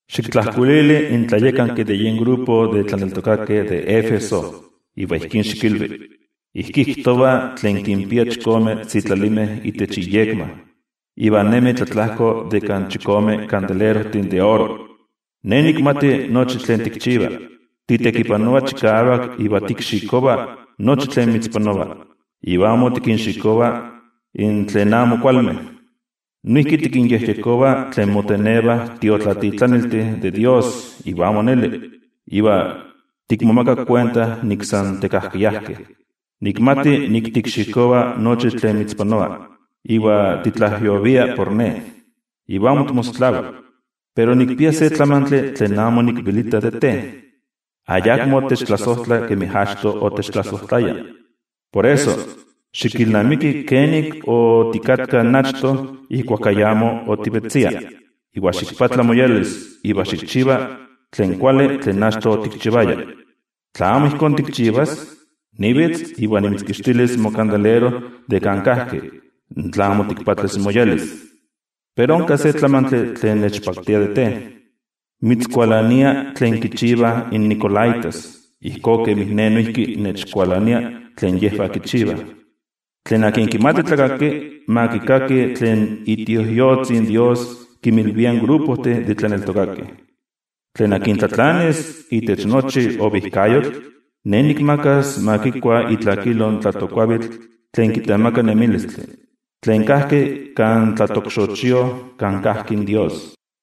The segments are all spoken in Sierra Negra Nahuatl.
’Xiktlajkuilili in tlayakanki de yen olololistli de tlaneltokakeh de Éfeso iva ijkí xikilvi: “Ijkí kijtova tlen kinpia chikome sitlalimeh itech iyekma, iva nemi tlatlajko de kan chikome kandelerojtih de oro: Ne nikmati nochi tlen tikchiva, titekipanova chikavak iva tikxikova nochi tlen mitzpanova, iva amo tikinxikova in tlen amo kualmeh. Noijki tikinyejyekova tlen motenevah tiotlatitlaniltih de toYejwatzi iva amo neli iva tikmomaka kuenta nik san tekajkayajkeh. Nikmati nik tikxikova nochi tlen mitzpanova, iva titlajyovia por Ne, iva amo timosotlava. Pero nikpia se tlamantli tlen amo nikvelita de te. Ayakmo techtlasojtla kemi achto otechtlasojtlaya. Por eso, xikilnamiki kenik otikatka in achto ijkuak ayamo otivetzia, iva ximoyolkuapa iva xikchiva tlen kuali tlen achto otikchivaya. Tla amo ijkó tikchivas, nivitz iva nimitzkixtilis mokandelero de kan kajki, tla amo timoyolkuapas. Pero onka se tlamantli tlen nechpaktia de te: mitzkualania tlen kichivah in nicolaítas, ijkó kemin Ne noijki nechkualania tlen yejvah kichivah. Tlen kimati tlakaki, ma kikaki tlen iTioijyotzi in Dios kinmilvia in olololistih de tlaneltokakeh. Tlen tlatlanis itech nochi ovijkayotl, Ne nikmakas ma kikua itlakilo in tlatokkuavitl tlen kitemaka nemilistli, tlen kajki kan tlaxochiojka kan kajki in Dios.”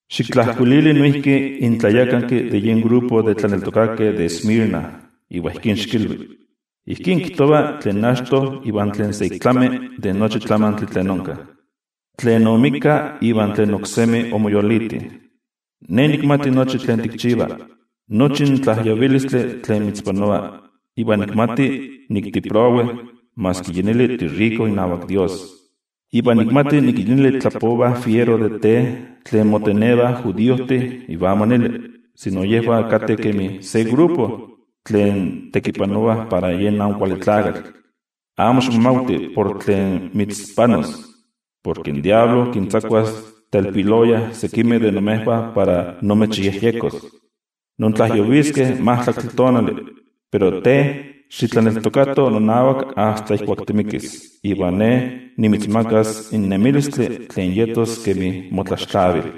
’Xiktlajkuilili noijki in tlayakanki de yen olololistli de tlaneltokakeh de Esmirna iva ijkí xikilvi: “Ijkí kijtova tlen achto iva tlen sa ik tlami de nochi tlamantli tlen onka, tlen oixpolika iva tlen oksemi omoyoliti: Ne nikmati nochi tlen tikchiva, nochi in tlajyovilistli tlen mitzpanova, iva nikmati nik tiprowe maski yi neli tiriko inavak Dios. Iva nikmati nik yi neli tlapovah fiero de te tlen motenevah judiojtih iva amo neli, sino yejvah kateh kemi se olololistli tlen tekipanovah para yen Amo Kuali Tlakatl. Amo ximomavti por tlen mitzpanos. Porke in Amo Kuali Tlakatl kintzakuas telpiloya sekimeh de imejvah para imechyejyekos. Intlajyoviskeh majtlaktli tonali, pero te xitlaneltokato nonavak asta ijkuak timikis, iva Ne nimitzmakas in nemilistli tlen yetos kemi motlaxtlavil.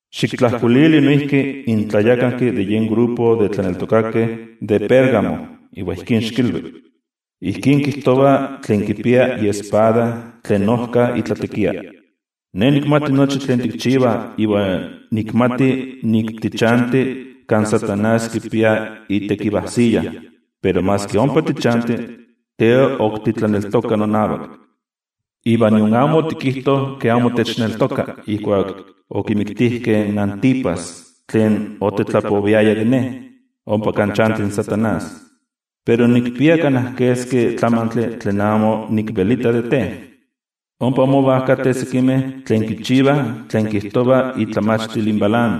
’Xiktlajkuilili noijki in tlayakanki de yen olololistli de tlaneltokakeh de Pérgamo iva ijkí xikilvi: “Ijkí kijtova tlen kipia iespada tlen ojka itlatekia: Ne nikmati nochi tlen tikchiva iva nikmati nik tichanti kan Amo Kuali Tlakatl kipia itekivajsiya, pero maski ompa tichanti, te ok titlaneltoka nonavak. Iva nion amo otikijto ke amo techneltoka ijkuak okimiktijkeh in Antipas tlen otetlapoviaya de Ne, ompa kan chanti Amo Kuali Tlakatl. Pero nikpia kana keski tlamantli tlen amo nikvelita de te. Ompa mova kateh sekimeh tlen kichivah tlen kijtova itlamachtil in Balaam.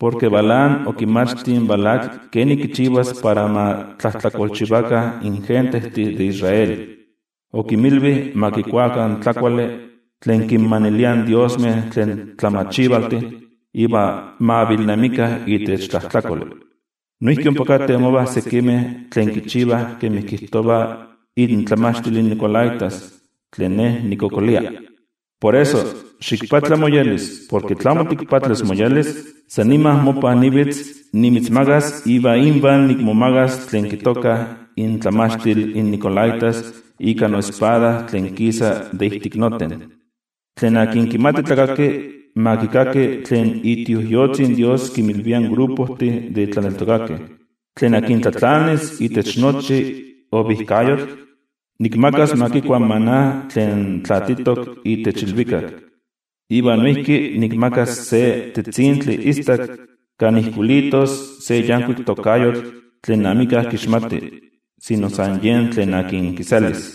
Porke Balaam okimachti in Balac ken kichivas para ma tlajtlakolchivakah in gentejtih de Israel. Okinmilvi ma kikuakah tlakuali tlen kinmaniliah in diosmeh tlen tlamachivaltih iva ma avilnemikah itech tlajtlakoli. Noijki ompa kateh mova sekimeh tlen kichivah kemi kijtova intlamachtil in nicolaítas, tlen Ne nikkualankaita. Por eso, ximoyolkuapa porke tla amo timoyolkuapas, san nima mopan nivitz nimitzmagas iva invah nikmomagas tlen kitokah intlamachtil in nicolaítas ika noespada tlen kisa de itech noten. Tlen kimati tlakaki, ma kikaki tlen iTioijyotzi in Dios kinmilvia in olololistih de tlaneltokakeh. Tlen tlatlanis itech nochi ovijkayotl, nikmakas ma kikua in maná tlen tlaatitok itech ilvikak. Iva noijki nikmakas se tetzintli istak kan ijkuilitos se yankuik tokayotl tlen amika kixmati, sino san yen tlen akin kiselis.”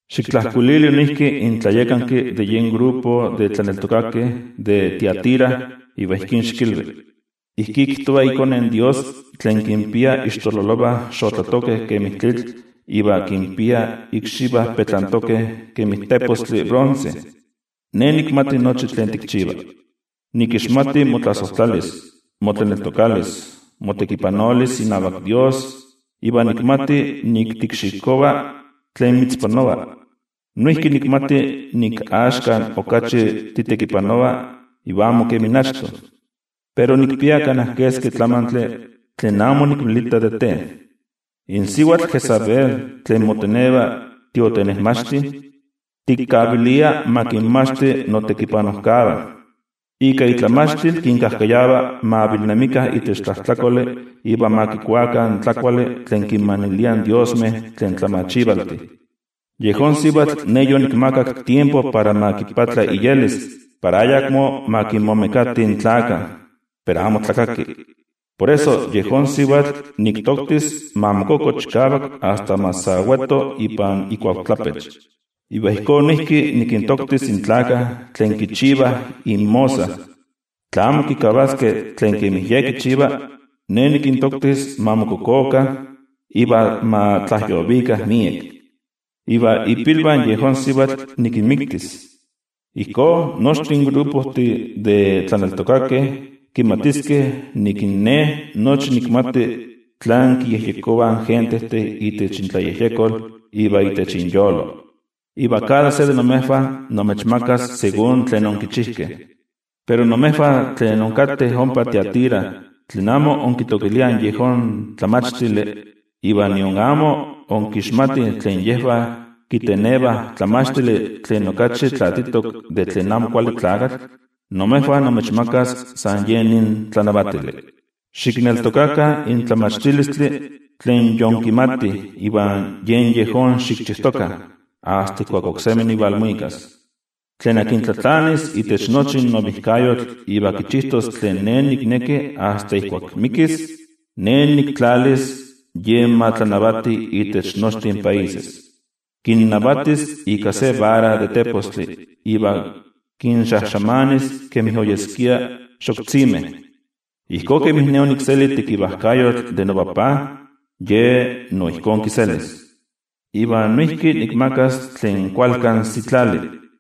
’Xiktlajkuilili noijki in tlayakanki de yen olololistli de tlaneltokakeh de Tiatira iva ijkí xikilvi: “Ijkí kijtova iKone in Dios, tlen kinpia ixtololovah xotlatokeh kemi tlitl iva kinpia ikxivah petlantokeh kemi tepostli bronce: Ne nikmati nochi tlen tikchiva. Nikixmati motlasojtlalis, motlaneltokalis, motekipanolis inavak Dios iva nikmati nik tikxikova tlen mitzpanova. Noijki nikmati nik axka okachi titekipanova iva amo kemi achto. Pero nikpia kana keski tlamantli tlen amo nikvelita de te. In sivatl Jezabel tlen moteneva tiotenejmachti, tikkavilia ma kinmachti notekipanojkavah. Ika itlamachtil kinkajkayava ma avilnemikah itech tlajtlakoli iva ma kikuakah in tlakuali tlen kinmaniliah in diosmeh tlen tlamachivaltih. Yejón sivatl Ne yonikmakak tiempo para ma moyolkuapa para ayakmo ma kinmomekati in tlakah, pero amo tlakaki. Por eso, yejón sivatl niktoktis ma mokoko chikavak asta ma sa weto ipan ikochtlapech, iva ijkó noijki nikintoktis in tlakah tlen kichivah inmosa, tla amo kikavaskeh tlen kemi ye kichiva, Ne nikintoktis ma mokokokah iva ma tlajyovikah miek. Iva ipilvah yejón sivatl nikinmiktis. Ijkó, nochtin olololistih de tlaneltokakeh kimatiskeh nik in Ne nochi nikmati tlán kiyejyekovah in gentejtih itech intlayejyekol iva itech inyolo. Iva kada se de imejvah nimechmakas ijkó kemi tlen onkichijkeh. Pero imejvah tlen inkateh ompa Tiatira, tlen amo inkiseguirovah yejón tlamachtili iva nion amo inkixmatih tlen yejvah kitenevah tlamachtili tlen okachi tlaatitok de tlen Amo Kuali Tlakatl, imejvah nimechmaka san yen nin tlanavatili: Xikneltokatokah in tlamachtilistli tlen yinkimatih iva yen yejón xikchijtokah, asta ijkuak oksemi nivalmuikas. Tlen tlatlanis itech nochi ovijkayotl iva kichijtos tlen Ne nikneki asta ijkuak mikis, Ne niktlalis yen ma tlanavati itech nochtin países. Kinnavatis ika se vara de tepostli, iva kinxajxamanis kemi oyeskia xoktzimeh. Ijkó kemin Ne onikseli tekivajkayotl de noTajtzi, ye no ijkó kiselis. Iva noijki nikmakas tlen kualkan sitlali.